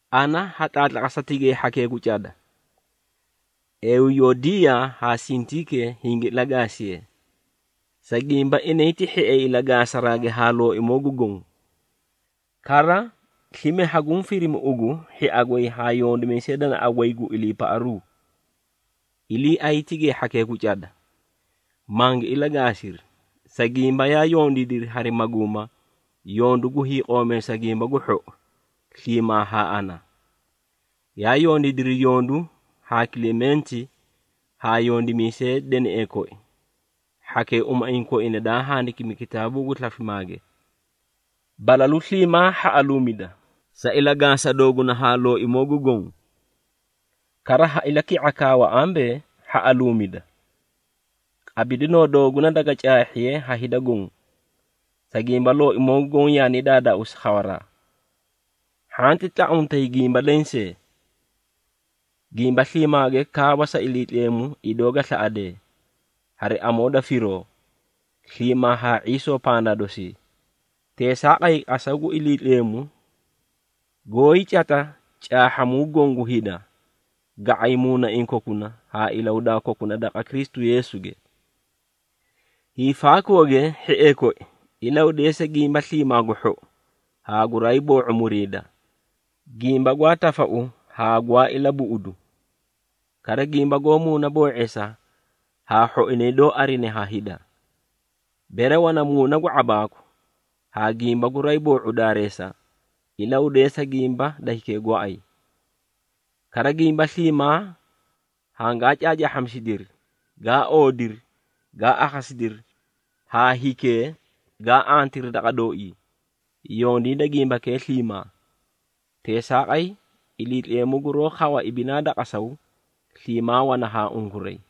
Ana ha tlaatlaqasa tigay hhakee gu cada, Euyodiyaa haa Sintiike hingi ilagaasiyee, sa gimba, inay ti hhiee ilagaasaraage haa Looimoo gu Goõ. Kara, slime haguũ firimi ugu, hhia goy haa yondimiisay danaꞌa goy gu iliipaꞌaruu, iliiay tigay hhakee gu cada, mangi ilagaasiri, sa gimba yaa yondiidiri hari maguuma, yondu gu hiiqoomeesa Gimba gu Hhou sliimaa haa ana. Yaa yondiidiri yondu haa Kilementi haa yondimiisee deneꞌee koi, hhakee umaiĩ koina daa handikimi kitaabuu gu slafimaage. Balalu sliimaa hhaꞌaluumida, sa ilagaasa dooguna haa Looimoo gu Goõ. Kara ha ilaki⁄a kaawa ambee, hhaꞌaluumida! Qabidinoo dooguna daga caahhiye ha hida goõ, sa gimba Looimoo gu Goõ yaani daadaauusi khawaraa! Hhanti tlaꞌamutay gimba lensee. Gimba sliimaage kaawa sa Iliitleemu idoo ga slaꞌadee, hari amoo da firoo, sliimaa haa ⁄iisoo pandaa dosii. Teesaaqay, qasaw gu Iliitleemu, goóyii cata caahhamuu goõ gu hida, ga⁄ay muunaiĩ kokuna haa ilahudaa kokuna daqa Kristu Yeesuge. Hiifaakooge, hhiee koi, ilahudeesa gimba sliimaa gu lou haa guraay boo⁄u muriida, gimba gwaa tafau haa gwaa ilabuꞌudu, kara gimba goó muunaboo⁄eesa haa hhoinay doó arine ha hida. Bere wana muuna gu ⁄abaaku haa gimba guraay boo⁄u daareesa, ilahudeesa gimba da hikee gooay. Kara gimba sliimaa hangaa caacaahhamisidiri, gaa oodiri, gaa akhasidiri haa hikee gaa antiri daqa dooii, yondiida gimbakee sliimaa. Teesaaqay, Iliitleemu guroó khawa ibinaa da qasaw, sliimaa wana haa unkuray.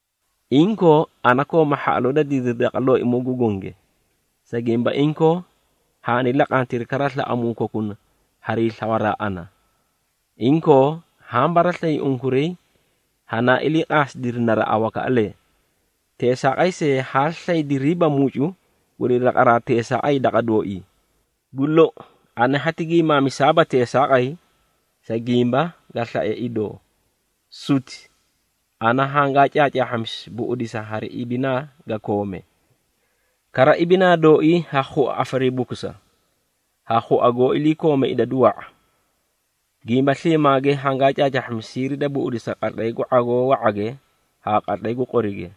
Inkoo, ana kooma hhaꞌaloo da didiri daqa Looimoo gu gonge, sa gimba inkoo haani laqantiri kara slaꞌamuu kokuna harii slawaraa ana. Inkoo, haã baraslayi unkuray hanaa iliiqaasidiri naraꞌa wakaꞌalee. Teesaaqay see, haa slaydiriiba mucu guri laqaraa teesaaqay daqa dooii. Gu lou, ana hati giimaamisaaba teesaaqay, sa gimba ga slae idoo, suti. Ana hangaa caacaahhamisi buꞌudisa hari ibinaa ga koome. Kara, ibinaa dooii ha khua afariibukusa, ha khua goó iliikoome idadu wa⁄a. Gimba sliimaage hangaa caacaahhamisi siiri da buꞌudisa qatlay gu ⁄agoo wa⁄age haa qatlay gu qorige,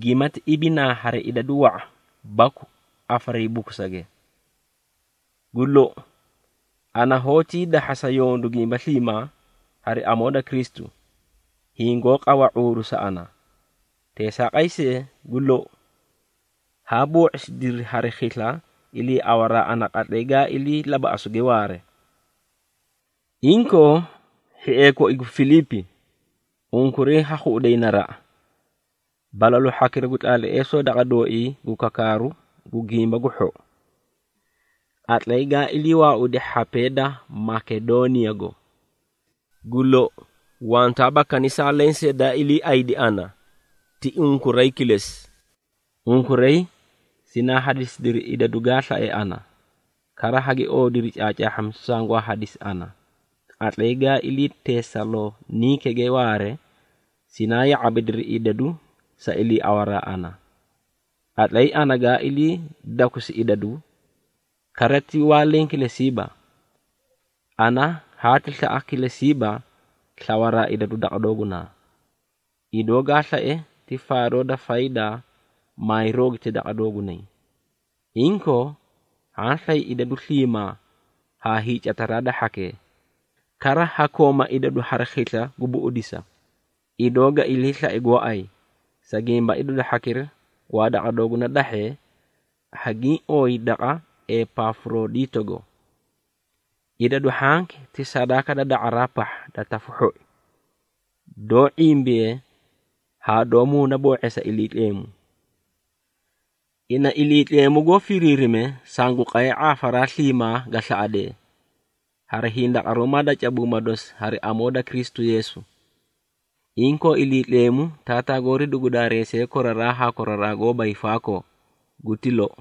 gimati ibinaa hari idadu wa⁄a baku afaariibukusage. Gu lou, ana hoótii dahhasa yondu gimba sliimaa, hari amoo da Kristu, hiĩ goó qawa ⁄uuru sa ana. Teesaaqay see, gu lou, haa boo⁄isidiri hari khisla, iliiawaraa ana qatlay gaa ilii labaꞌasuuge waare. Inkoo, hhiee koi gu Filiipi, unkuray ha khuꞌuday naraꞌa, balalu hhakira gu tlaatleesoo daqa dooii gu kakaaru Gimba gu Hhou, qatlay gaa ilii waaudi hhapee da Makedooniyago. Gu lou, wantaaba kanisaa lensee daa iliiaꞌaydi ana ti unkuray kilesi. Unkuray sinaa hadisidiri idadu gaa slae ana, kara hagi oodiri caacaahhamisu sangwaa hadisi ana. Qatlay gaa ilii Tesaloniikege waare, sinaa ya⁄abidiri idadu sa iliiawaraa ana, qatlay ana gaa ilii dakusi idadu, kara ti waa leẽ kilesiiba. Ana hati slaꞌa kilesibaa slawaraa idadu daqa doogunaa, idoo ga slae ti faadoo da faydaa maay roogiti daqa doogunay. Inkoo, haã slay idadu sliimaa haa hiicataraa da hhakee, kara ha kooma idadu hari khisla gu buꞌudisa, idoo ga ilii slae gooay, sa gimba idadu hhakira gwaa daqa dooguna dahhee, hagiĩ ooyi daqa Epafurodiitogo. Idadu hhanki ti sadaaka da da⁄araa pahha da tafu hhoi, doó ⁄imbiye haa doó muunaboo⁄eesa Iliitleemu. Ina Iliitleemu goó firiirime, sangu qay ⁄aafaraa sliimaa ga slaꞌadee, hari hindaqaruumaa da cabuuma dosi hari amoo da Kristu Yeesu. Inkoo, Iliitleemu, Taataa goori dugu daareesiye koraraa haa koraraa goóba hiifaakoo. Guti lou.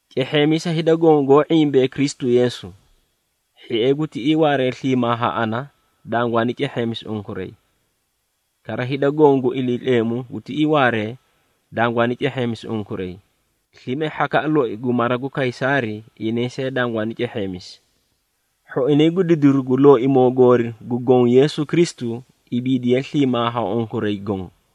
Cehheemisa hida goõ goó ⁄imbee Kristu Yeesu. Hhiee gu tiꞌii waaree sliimaa haa ana, dangwaani cehheemisi unkuray. Kara hida goõ gu Iliitleemu gu tiꞌii waaree, dangwaani cehheemisi unkuray, slime hhakaꞌa loi gu mara gu Kaysaari, inay see dangwaani cehheemisi. Hhoinay gu didiru gu Looimoo goori gu Goõ Yeesu Kristu, ibiidiye sliimaa haa unkuray goõ.